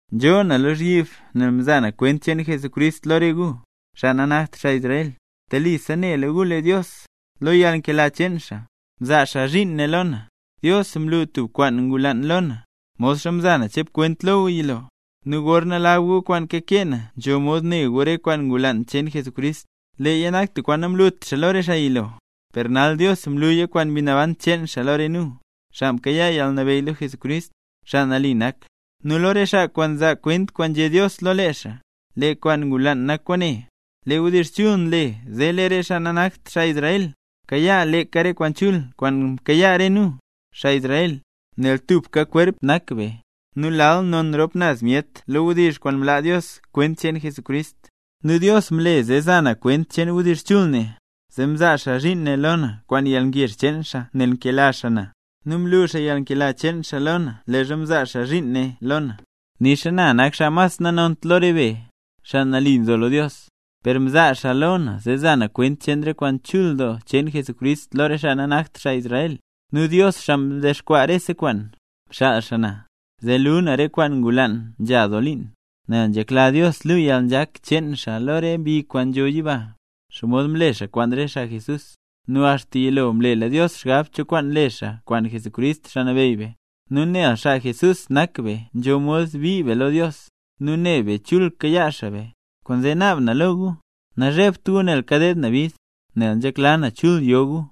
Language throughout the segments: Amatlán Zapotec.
Nzhoo na lozhyib nel mzaa na kwent cheen Jesucrist lo re gu, xaa nanakt xaa Israel. Telisa nela gu lee Dios, lo yalnkela cheen xaa, mzaa xaa zhiin ne lo na. Dios mlu tub kwaan ngulaan lo na, modxa mza na chep kwent lo gu yilo. Nu gorna lab gu kwaan kakee na nzho mod ne gu re kwaan ngulaan cheen Jesucrist. Leeya nak tub kwaan namlut xaa lo re xaa yilo, per nal Dios mluya kwaan Mbi Naban cheen xaa lo re nu, xaa mkayaa yalnabeyy lo Jesucrist, xaa nambey nak, nu lo re xaa kwaan nzaa kwent kwaan nzhé Dios lo lee xaa. Lee kwaan ngulaan nak kwaane: Lee wdizh chul nle zee lee re xaa nanakt xaa Israel, kayaa leeka re kwaan chul kwaan nkayaa re nu, xaa Israel, nel tubka kwerp nak be, nu lal non rop naz be lo wdizh kwaan mlaa Dios kwent cheen Jesucrist. Nu Dios mle zee za na kwent cheen wdizh chul ne, zee mzaa xaa zhiin ne lo na kwaan yalngezh cheen xaa nel nkela xaa na. Nu mlu xaa yalnkela cheen xaa lo na leezha mzaa xaa zhiin ne lo na, nixa na nak xaa mas nanont lo re be, xaa mle nambey Jesús. Per mzaa xaa lo na zee za na kwent cheen re kwaan chul doo cheen Jesucrist lo re xaa nanakt xaa Israel. Nu Dios, xaa mdexkwaa rese kwaan, mxaal na, zee luu na re kwaan ngulaan nzha doo liin. Nel nzhekla Dios luu yalnzhak cheen xaa lo re mbi kwaan nzho yiba, xomod mle xaa kwaan re xaa Jesús. Nu axta yilo mlela Dios xgab cho kwaan le xaa kwaan Jesucrist, Xaa Nabeyy be. Nu nel xaa Jesús nak be nzho mod bii be lo Dios, nu ne be chul kayaa xaa be. Kwaanzee naab na lo gu, nazhebt gu nel kadeed na bid, nel nzhekla na chul yo gu.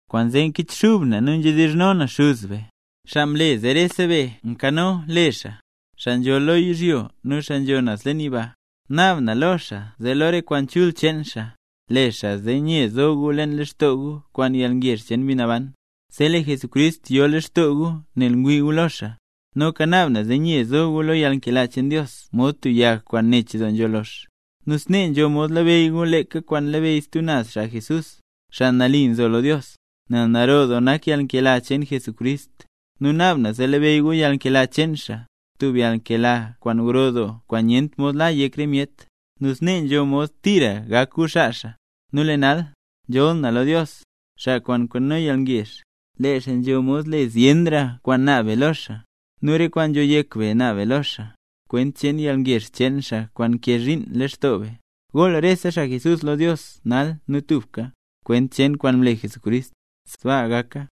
Kwaanzee nkichxub na nu nzhedizhno na Xuz be, xaa mle zee rese be nkano le xaa, xaa nzho lo yizhyo nu xaa nzho naz leen yiba. Naab na lo xaa zee lo re kwaan chul cheen xaa, le xaa zee nye zo gu leen lextoo gu kwaan yalngezh cheen Mbi Naban, zee lee Jesucrist yo leen lextoo gu nel ngwii gu lo xaa. Noka naab na zee nye zo gu lo yalnkela cheen Dios mod tub yag kwaan nech nzho lox. Nu snee nzho mod labeyy gu leeka kwaan labeyy stub naz xaa Jesús, xaa nambey, nel naro doo nak yalnkela cheen Jesucrist. Nu naab na zee labeyy gu yalnkela cheen xaa, tub yalnkela kwaan gro doo kwaan nyent mod la yek re myet, nu snee zee nzho mod tira gak gu xaa xaa. Nu lee nal, nzholl na lo Dios, xaa kwaan nkano yalngezh; lee xaa nzho mod le zyenra kwaan naab be lo xaa, nu re kwaan nzho yek be naab be lo xaa, kwent cheen yalngezh cheen xaa, kwaan nkee zhiin leen lextoo be. ¡Gool rese xaa Jesús lo Dios nal nu tubka, kwent cheen kwaan mle Jesucrist! ¡Sbaa gaka!